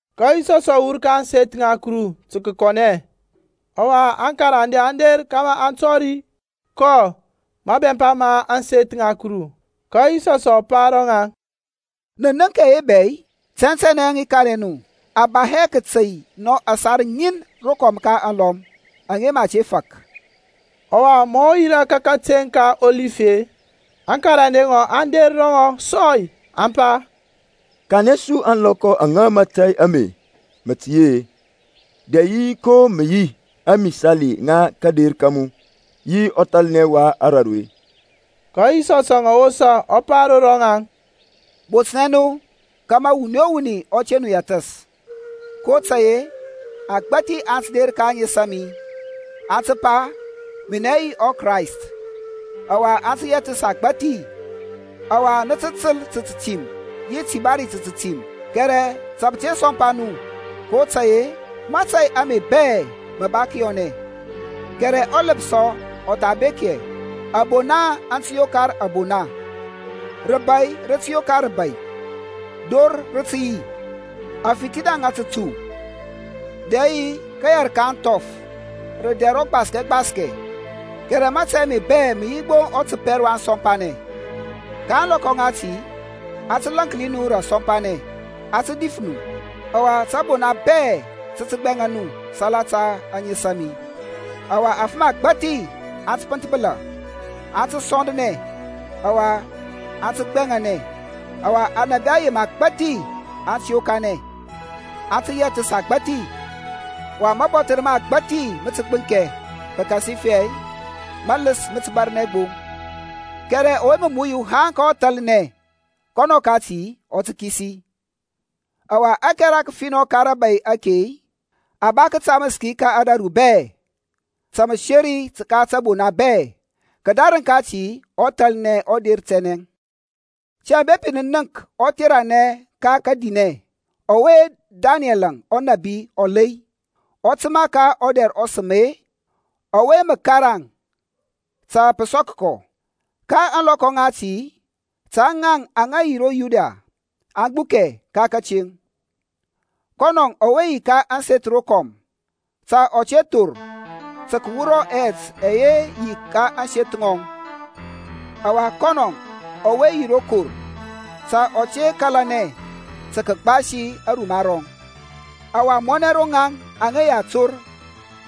Ka Yisɔsȧŋ ɔ wur ka ȧŋseth ŋa Kuru tǝ kǝkɔnɛ, ɔwa aŋkarande aŋ der kȧmȧ aŋ tɔri kɔ mabɛmpa ma ȧŋseth ŋa Kuru. Ka Yisɔs ɔ pa ro ŋaŋ, Nǝ nənk ɛye bɛ-i? Tɛntɛnɛ i kanɛ nu a ba hɛ kǝtey nɔ ȧsar ŋin rokɔm ka alɔm aŋa mǝ a te fak. Ɔwa ma ɔ yirȧ ka kateŋ ka Ɔlif-e, aŋkarande ŋɔŋ aŋ der ro ŋɔŋ sɔy, aŋ pa, Kanɛ su ȧŋlɔkɔ aŋa mȧtȧy ame mǝ tǝ yi-e, dɛ yi ko mǝ yi ȧŋmisali ŋa kȧder ka mu, yi ɔthalnɛ wa raru-e? Ka Yisɔsȧŋ ɔ wosa ɔ pa ro rɔŋaŋ, Botnɛ nu kȧmȧ wuni o wuni ɔ te nu yɛthǝs. kotȧy-e agbȧthi aŋ tǝ der ka ȧŋes a mi, aŋ tǝ pa, Minɛ yi ɔKrayst, ɔwa aŋ tǝ yɛthǝs agbȧthi. Ɔwa nǝ tǝ tǝl ta tǝtim yi tibari ta tǝtim, kɛrɛ ta pǝ te sɔmpa nu kotȧy-e mȧtȧy ame bɛ mǝ ba kǝyɔnɛ. Kɛrɛ ɔlǝpsɔ ɔ tha bek hɛ. Abona aŋ tǝ yokar abona, rǝbai rǝ tǝ yokar rǝbai, dor rǝ tǝ yi, afithina ŋa tǝtu dɛ yi kǝyɛr ka ȧŋthɔf rǝ dɛr ɔgbaskɛ gbaskɛ. Kɛrɛ mȧtȧy ame bɛ mǝ yi gbo ɔtǝpɛr wa ȧŋsɔmpanɛŋ. Ka ȧŋlɔkɔ ŋati a tǝ lȧnki nu rǝ asɔmpanɛ, a tǝ dif nu, ɔwa tǝbona bɛ tǝ tǝ gbɛŋa nu salata ȧŋes a mi. Ɔwa afǝm agbȧthi aŋ tǝ pǝnthbǝla, aŋ tǝ sɔndanɛ, ɔwa aŋ tǝ gbɛŋanɛ. Ɔwa anȧbi ayem agbȧthi aŋ tǝ yokanɛ, aŋ tǝ yɛthǝs agbȧthi. Ɔwa mȧbɔthǝr ma agbȧthi mǝ tǝ gbǝnkɛ pǝkasifɛ mǝlǝs mǝ tǝ bȧrnɛ gbo. Kɛrɛ ɔwe mǝ muyu haŋ ka ɔthalnɛ, kɔnɔ kati ɔ tǝ kisi. Ɔwa ȧkɛra kǝfinɔ ka rȧbȧy ake-e, a ba kǝtamǝs ki ka ȧdȧru bɛ ta mǝseri ka tǝbona bɛ. Kǝdarǝŋ kati ɔthalnɛ ɔ der tɛnɛ. Tiyȧŋ, bepi nǝ nənk ɔtheranɛ ka kadinɛ ɔwe Danɛl ɔnȧbi ɔ lei, ɔ tǝma ka ɔdɛr ɔsǝm-e, (ɔwe mǝ karaŋ ta pǝ sɔk kɔ) ka ȧŋlɔkɔ ŋati ta ŋaŋ aŋa yi ro Yudia aŋ gbukɛ ka tȧteŋ. Kɔnɔ ɔwe yi ka ȧŋseth rokɔm ta ɔ te thor tǝ kǝwura ɛyɛt ɛyɛ yi ro seth kɔŋ. Ɔwa kɔnɔ ɔwe yi ro kor ta ɔ te kȧlanɛ tǝ kǝgbasi aruma rɔŋ. Ɔwa mɔnɛ ro ŋaŋ aŋa yi ator,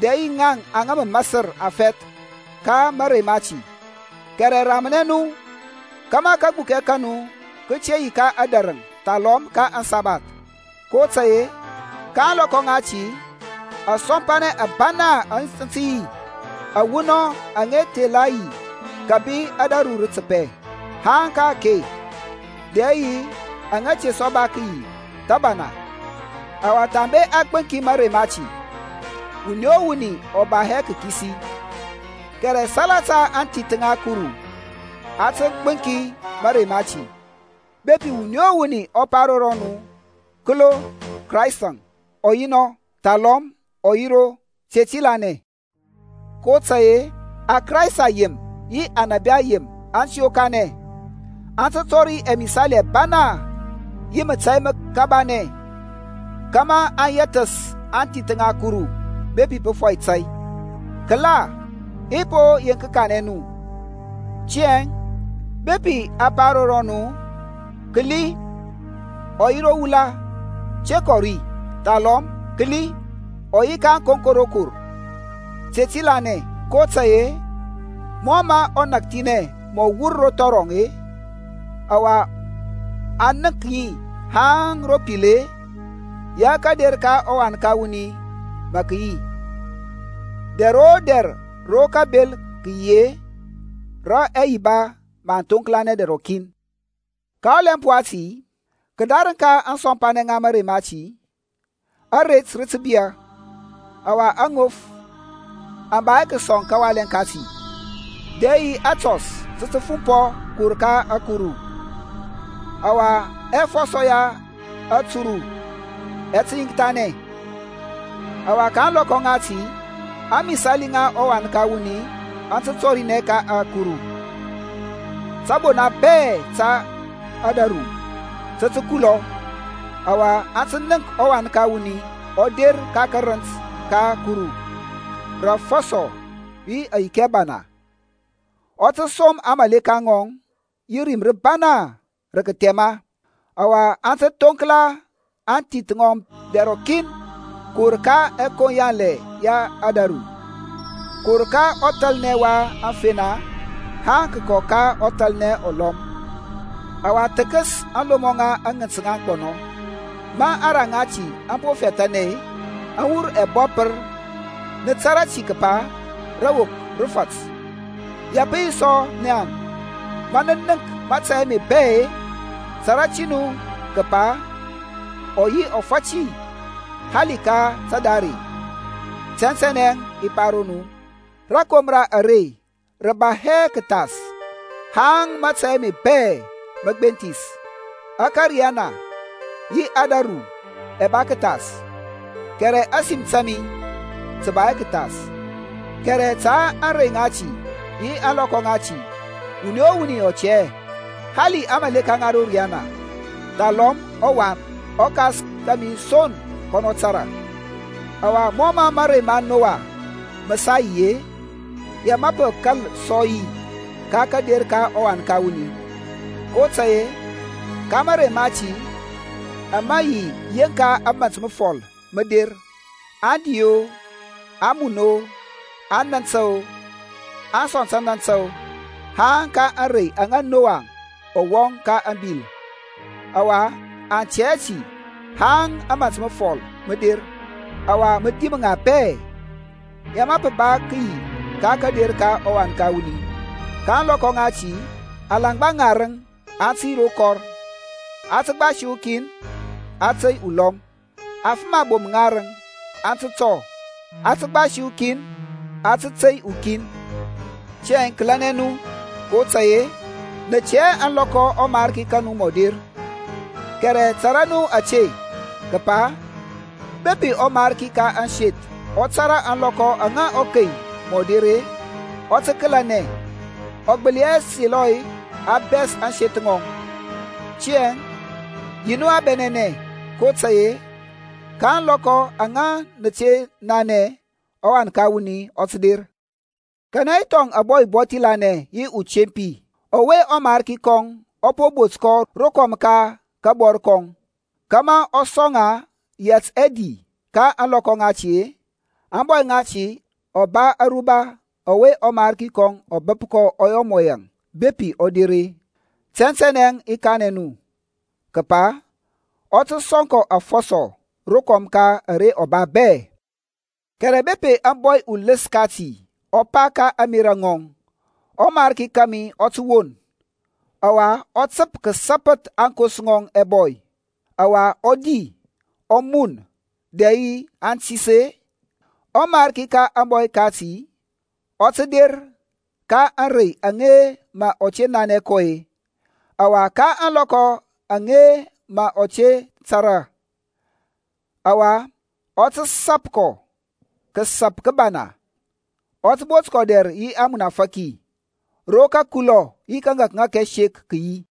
dɛ yi ŋaŋ aŋa mǝ masǝr afɛth ka mȧrey mati! Kɛrɛ ramnɛ nu kȧmȧ kagbukɛ ka nu kǝ te yi ka adarǝŋ thalɔm ka aŋsabath, kotȧy-e ka ȧŋlɔkɔ ŋati asɔmpanɛ ȧbana aŋ tǝ yi awunɔŋ aŋa te tha la yi kǝbi ȧdȧru rǝ tǝpɛ haŋ ka-ake, dɛ yi aŋa te sɔ ba kǝyi thǝbana. Ɔwa thambe a gbǝŋki mȧrey mati-e, wuni o wuni ɔ ba hɛ kǝkisi; kɛrɛ salata aŋthith ŋa Kuru a tǝ gbǝŋki mȧrey mati. Bepi wuni o wuni ɔ pa ro nu, Kǝlo, Kraistȧŋ ɔ yi nɔ, thalɔm ɔ yi ro, te ti lanɛ. kotȧy-e aKrayst ayem yi anȧbi ayem aŋ tǝ yokanɛ, aŋ tǝ tɔri ɛmisali ɛbana yi mətȧy mǝkabanɛ, kȧmȧ a yɛthǝs aŋthith ŋa Kuru bepi pǝ fɔi tȧy. Kǝla i po yeŋk kanɛ nu. Tiyȧŋ bepi a pa ro nu, Kǝli, ɔ yi ro wula, te kɔ ri. Thalɔm, Kǝli, ɔ yi ka tǝkoŋko rokor, te ti lanɛ. kotȧy-e mɔ mǝ ɔnakthinɛ mǝ ɔ wur ro thɔrɔŋ-e, ɔwa a nənk ŋi haŋ ro pil-e, ya kȧder ka ɔWan ka wuni mǝ kǝ yi. Dɛr o dɛr rǝ kabel kǝ yi-e, rǝ ɛyiba mǝ aŋ thoŋklanɛ dɛr rɔkin. Ka ɔlɛmp wati, kǝdarǝŋ ka kasɔmpanɛ ka mȧrey mati, aret rǝ tǝ biyȧ, ɔwa aŋof aŋ ba hɛ kǝsɔŋ kawalɛ kati, dɛ yi atɔs tǝ tǝ fumpɔ kǝwur ka ȧkuru, ɔwa ɛfɔsɔ ya ȧturu ɛ tǝ yiŋkthanɛ. Ɔwa ka ȧŋlɔkɔ ŋati ȧŋmisali ŋa ɔWan ka wuni aŋ tǝ tɔrinɛ ka ȧkuru. Tȧbona bɛ ka ȧdȧru tǝ tǝ kulɔ, ɔwa aŋ tǝ nənk ɔWan ka wuni ɔ der ka karǝnt ka ȧkuru rǝ afɔsɔ yi ayiki ȧbana. Ɔ tǝ som aŋmȧleka ŋɔŋ yi rim rǝbana rǝ kǝthɛma, ɔwa aŋ tǝ thoŋkla aŋthith ŋɔŋ dɛr rɔkin kǝwur ka ɛkoŋ yanlɛ ya ȧdȧru, kǝwur ka ɔthalnɛ wa aŋfena haŋ kǝkɔ ka ɔthalnɛ ɔlɔm. Ɔwa thǝkǝs aŋlomɔ ŋa aŋǝnt ŋa aŋgbɔnɔ. Ma aŋra ŋati aŋ po fɛthȧnɛ-e, aŋ wur ɛbɔpǝr, nǝ tȧrȧ ti kǝpa rawok rǝ fat. Ya pǝ yi sɔ naŋ-e, ma nǝ nənk mȧtȧy ame bɛ-e, tȧrȧ ti nu kǝpa ɔ yi ɔfati, hali ka tadare. Tɛntɛnɛ i pa ro nu, rȧkomra are rǝ ba hɛ kǝthas haŋ mȧtȧy ame bɛ mǝ gbenthis. Ȧkȧriyana yi ȧdȧru ɛ ba kǝthas, kɛrɛ ȧsim ta mi tǝ ba hɛ kǝthas. Kɛrɛ ta ȧŋrey ŋati yi ȧŋlɔkɔ ŋati wuni o wuni ɔ tɛ hɛ, hali aŋmȧleka ŋa ro riyana, thalɔm ɔWan. ƆKas kȧmi son kɔnɔ tȧrȧ. Ɔwa mɔ mȧrey ma Noaȧŋ mǝ sa yi-e, ya mǝ pǝ kȧl sɔ yi ka kȧder ka ɔWan ka wuni. kotȧy-e ka mȧrey mati ama yi yeŋka ȧmȧnt mǝfɔl mǝ der, aŋ di-o, aŋ mun-o, aŋ nantȧ-o, aŋ sɔŋ tǝnantǝ haŋ ka ȧŋrey aŋa Nowaŋ ɔ wɔŋ ka ȧŋbil. Ɔwa aŋ tɛ hɛ ti haŋ ȧmȧnt mǝfɔl mǝ der, ɔwa mǝ dim ŋa bɛ; ya mǝ pǝ yi ka kȧder ka ɔWan ka wuni. Ka ȧŋlɔkɔ ŋati alaŋgba ŋarǝŋ aŋ tǝ yi ro kɔr; a tǝ gbasi ukin, a tǝ tey ukin. Afǝm abom ŋarǝŋ aŋ tǝ tɔ; a tǝ gbasi ukin, a tǝ tey ukin. Tiyȧŋ, kǝlɛnɛ nu, kotȧy-e nǝ tɛ hɛ ȧŋlɔkɔ ɔMarki ka nu mǝ ɔ der. Kɛrɛ tȧrȧ nu ȧte kǝpa bepi ɔmarki ka ȧŋseth ɔ tȧrȧ ȧŋlɔkɔ aŋa ɔkei mǝ ɔ der-e, ɔ tǝ kǝlɛnɛ, ɔ gbǝli hɛ selɔ a bɛs ȧŋseth ŋɔŋ. Tiyȧŋ yi nu a bɛnɛnɛ kotȧy-e ka ȧŋlɔkɔ aŋa mǝ nǝ te nanɛ ɔWan ka wuni ɔ tǝ der. Kanɛ yi thɔŋ ȧŋbɔy ubɔthi lanɛ yi atempi, ɔwe ɔmarki kɔŋ ɔ po bot kɔ rokɔm ka kabɔr kɔŋ, kȧmȧ ɔ sɔŋ ŋa yɛt ɛdi ka ȧŋlɔkɔ ŋati-e? Ȧŋbɔy ŋati ɔ ba aruba ɔwe ɔmarki kɔŋ ɔ bǝp ɔ yɔ mɔ yaŋ bepi ɔ der-e. Tɛntɛnɛ i kanɛ nu kǝpa ɔ tǝ sɔŋ kɔ afɔsɔ rokɔm ka ara ɔ ba bɛ. Kɛrɛ bepi ȧŋbɔy ulǝs ŋati ɔ pa ka ȧŋmerȧ ŋɔŋ, Ɔmariki kȧmi ɔ tǝ won. Ɔwa ɔ tǝp kǝsapǝth aŋkos ŋɔŋ ɛbɔy, ɔwa ɔ di, ɔ mun dɛ yi antis-e. Ɔmariki ka ȧŋbɔy ŋati ɔ tǝ der ka ȧŋrey aŋa mǝ ɔ te nanɛ kɔ-e, ɔwa ka ȧŋlɔkɔ aŋa mǝ ɔ te tȧrȧ. Ɔwa ɔ tǝ sȧp kɔ kǝsȧp kǝbana, ɔ tǝ bot kɔ dɛr yi ȧŋmunafȧki, ro kȧkulɔ yi kȧŋȧkŋȧk ɛsek kǝ yi.